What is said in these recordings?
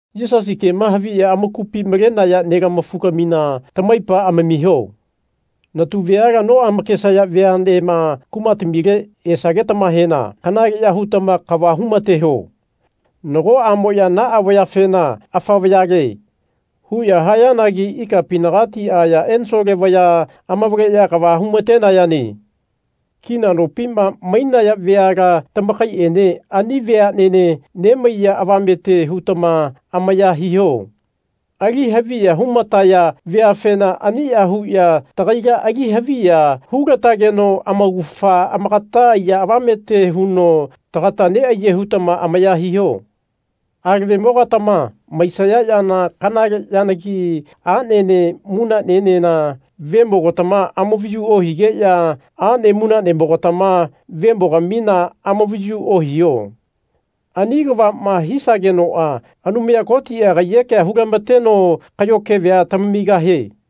Yisasi kema haviya amakupi malenaya nelama-fugamina tamaipa amamiho. Natu veala noamakesaya veanema, kumatamile esagetamahena kanaleya hutama kava humateho. Nagoamoya naa vayafena Afa vayale. huya hayanagi ikapinagati aya ensole vaya amavaleya kava humatenayane. Kina nopima mainaya veala tamakaiene ani veanene nemaiya avamete hutama amaya hiho. Ali haviya humataya veafena ania huya tagaila ali haviya hulatageno amaugafa amakata aiya avamete huno tagata neaye hutama amaya hiho. Alavemo-gatama maisaya yana kanale yanagi anene munanenena vemogatama amavayu ohigeya ane munanemo-gatama vemogamina amavayu ohiho. Ani kavama hisagenoa Anumaya Koti kaiyekea hulamateno kayo keve tamamigahie.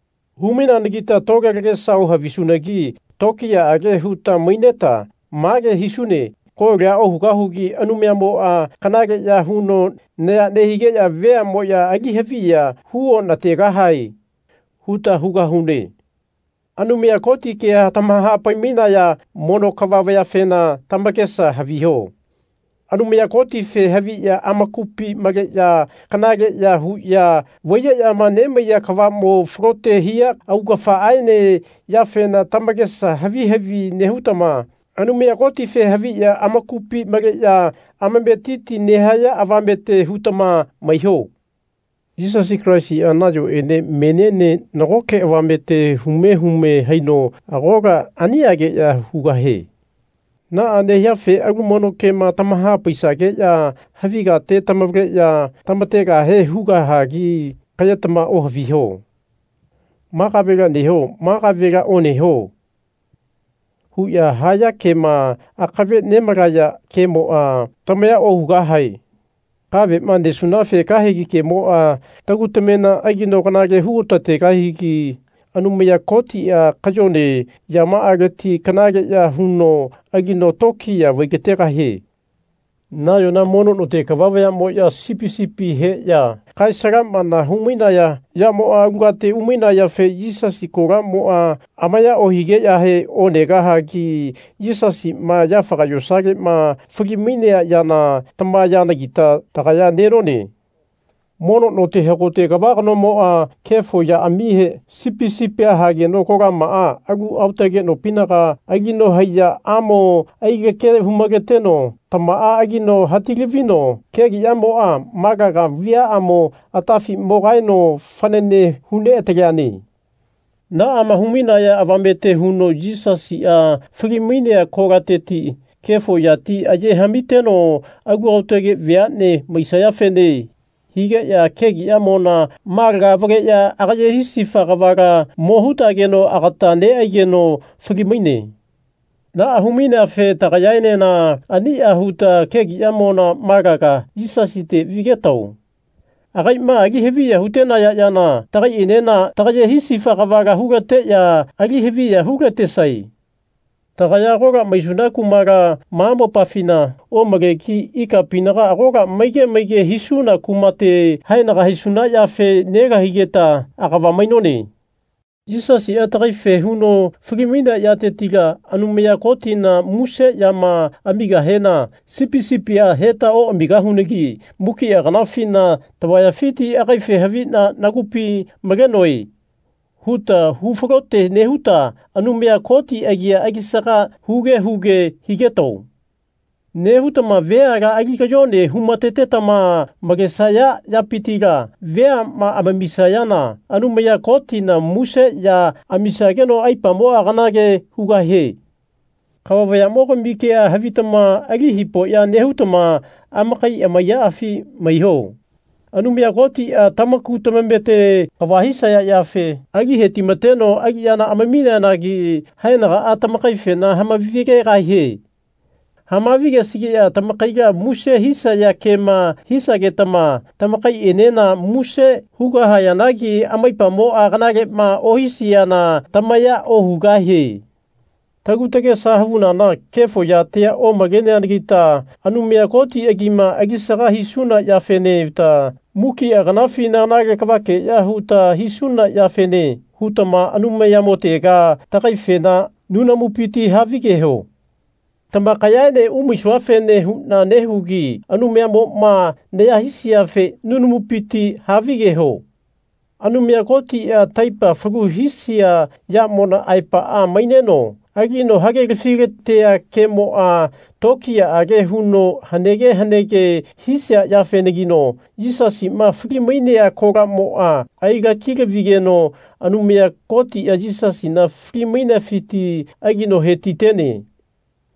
Hu-maineanagita tole lagesa ohavisunagi tokiyaage huta maineta mage hisune Kolia ohugahugi Anumayamoa kanaleya huno naya nehigeya veamoya ali haviya hu onategahae. huta hugahune. Anumaya Koti kea tamahapai-mainaya mono kava vayafena tamakesa haviho. Anumaya Kotife haviya amakupi maleya kanaleya huya vaiyeyama nemaiya kavamo falote hia augafaaene yafena tamakesa havi havi nehutama Anumaya Kotife haviya amakupi maleya amametiti nehaya avamete hutama maiho. Yisasi Kalaisia nayoene meniene nagoke avamete hume hume haino agola aniageya hugahie. Naa nehiafe alu mono kema tamahapaisageya havi kate tamavaleya tamategahe hugahagi kayema ohaviho. Ma kavela neho ma kavela oneho. huya haya kema akave nemalaya kemoa tamaya ohugahae. Kavemo nesunafe kahegi kemoa tagu tamena alino kanale hu otategahigi Anumaya Kotia kayone yamaaleti kanaleya huno alino tokiya vai-lategahie. Nayona mono note kava vayamoya sipi sipi heya kae-salamana hu-mainaya yamoa alu kate umainayafe Yisasi kolamoa amaya ohigeyahe onegahagi Yisasima yafaga yosalema fali-mainea yana tama yanagita tagaya nenone. Mono note hagote kava kanomoa kefo yaamihe sipi sipia hageno kolamaa alu aotage nopinaga alino haiyaamo ailake hu-maleteno tamaa alino hati-lavino kegiyamoa malaga viaamo atafi mo kaeno fanane hu neataleane. Naama humainaya avamete huno Yisasia fali-mainea kolateti kefo yati aye hamiteno alu aotage veane maisayafene higeya kegiyamona malaga avaleya agaye hisifa kavala mo hutageno agata neaigeno fali-maine. Naa hu-maineafe tagayaenena ania huta kegiyamona malaga Yisasite vigetao. Agaima ali haviya hutenaya yana tagaienena tagaye hisifa kavala hulateya ali haviya hulatesae. Tagaya agola maisuna kumala ma mopafina omalegi ikapinaga agola maige maige hisuna kumate haenaga haisuna yafe nelahaigeta agava mainone. Yisasia tagaife huno fali-mainea yatetila Anumaya Kotina muse yama amigahena sipi sipia heta oamigahunagi mukia kanafina tavayafiti Agaife havina nagupi malenoe. huta hu falote nehuta Anumaya Koti agia alisaga huge huge higetao. Nehutama veala ali kayone humatetama malenesaya yapitila veama amamisayana Anumaya Kotina muse ya amisageno aipamoa kanale hugahie. Kava vayamogami kea havitama ali hipoya nehutama amakai amaiyaafi maiho. Anumaya Kotia tamaku tamamete kava hisaya yafe ali hetimateno aliyana amamineanagi haenagaa tamakaifena hamavi-gegahie. Hamavi-gesigeya tamakaila muse hisaya kema hisagetama tamakaienena muse hugahayanagi amaipamoa kanalema ohisiana tamaya ohugahie. Tagu tagesa havunana kefo yatia omaleanagita Anumaya Koti agima alisaga hisuna yafene huta mukia kanafina kanale kavakeya huta hisuna yafene hutama Anumayamotega tagaifena nunamupiti havigeho. Tamakayaene umaisuafene huna nehugi Anumayamoma naya hisiafe nunamupiti havigeho. Anumaya Kotia taipa falu hisia yamona aepaa maineno alino hagelafi-latea kemoa tokiyaage huno hanege hanege hisia yafenagino Yisasima fali-mainea kolamoa ailaki-lavigeno Anumaya Kotia Yisasina fali-mainefiti alino hetitene.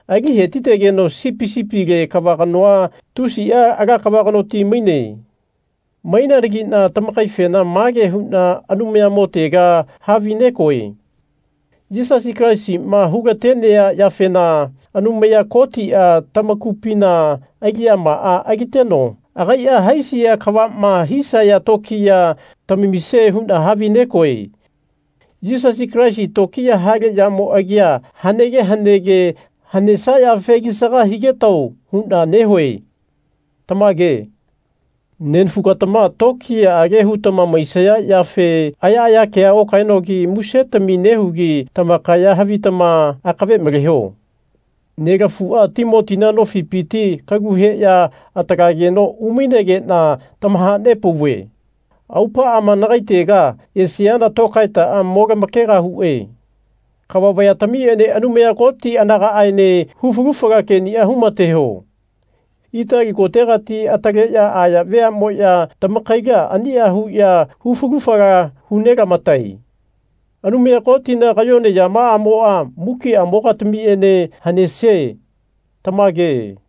Ali hetitegeno sipi sipile kava kanoa tusia ala kava kanoti maine. Maineanagina tamakaifena mage huna Anumayamotega havinegoe. Yisasi Kalaisima hulatenea yafena Anumaya Kotia tamakupina aliyamaa aliteno agaia haisia kavama hisaya tokiya tamamisie huna havinegoe. Yisasi Kalaisi tokiya hale yamo agia hanege hanege hanesia yafe alisaga higetao huna nehue. Tamage. Nenafu-gatama tokiyaage hutama maisaya yafe ayaaya kea okaenogi musetami nehugi tamakaya havitama akave maleho. Nelafua Timotina nofipiti kalu heya atalageno umainegena tamahanepauve. Aupaama nagaitega esiana tokaetaa mo lamakegahue. Kava vayatamiene Anumaya Koti anagaaene hu falu fala kenia humateho. Itali kotegati ataleya aya veamoya tamakaila ania huya hu falu fala hu nelamatae. Anumaya Kotina kayone yamaamoa mukiamo-gatamiene hanesie. Tamage.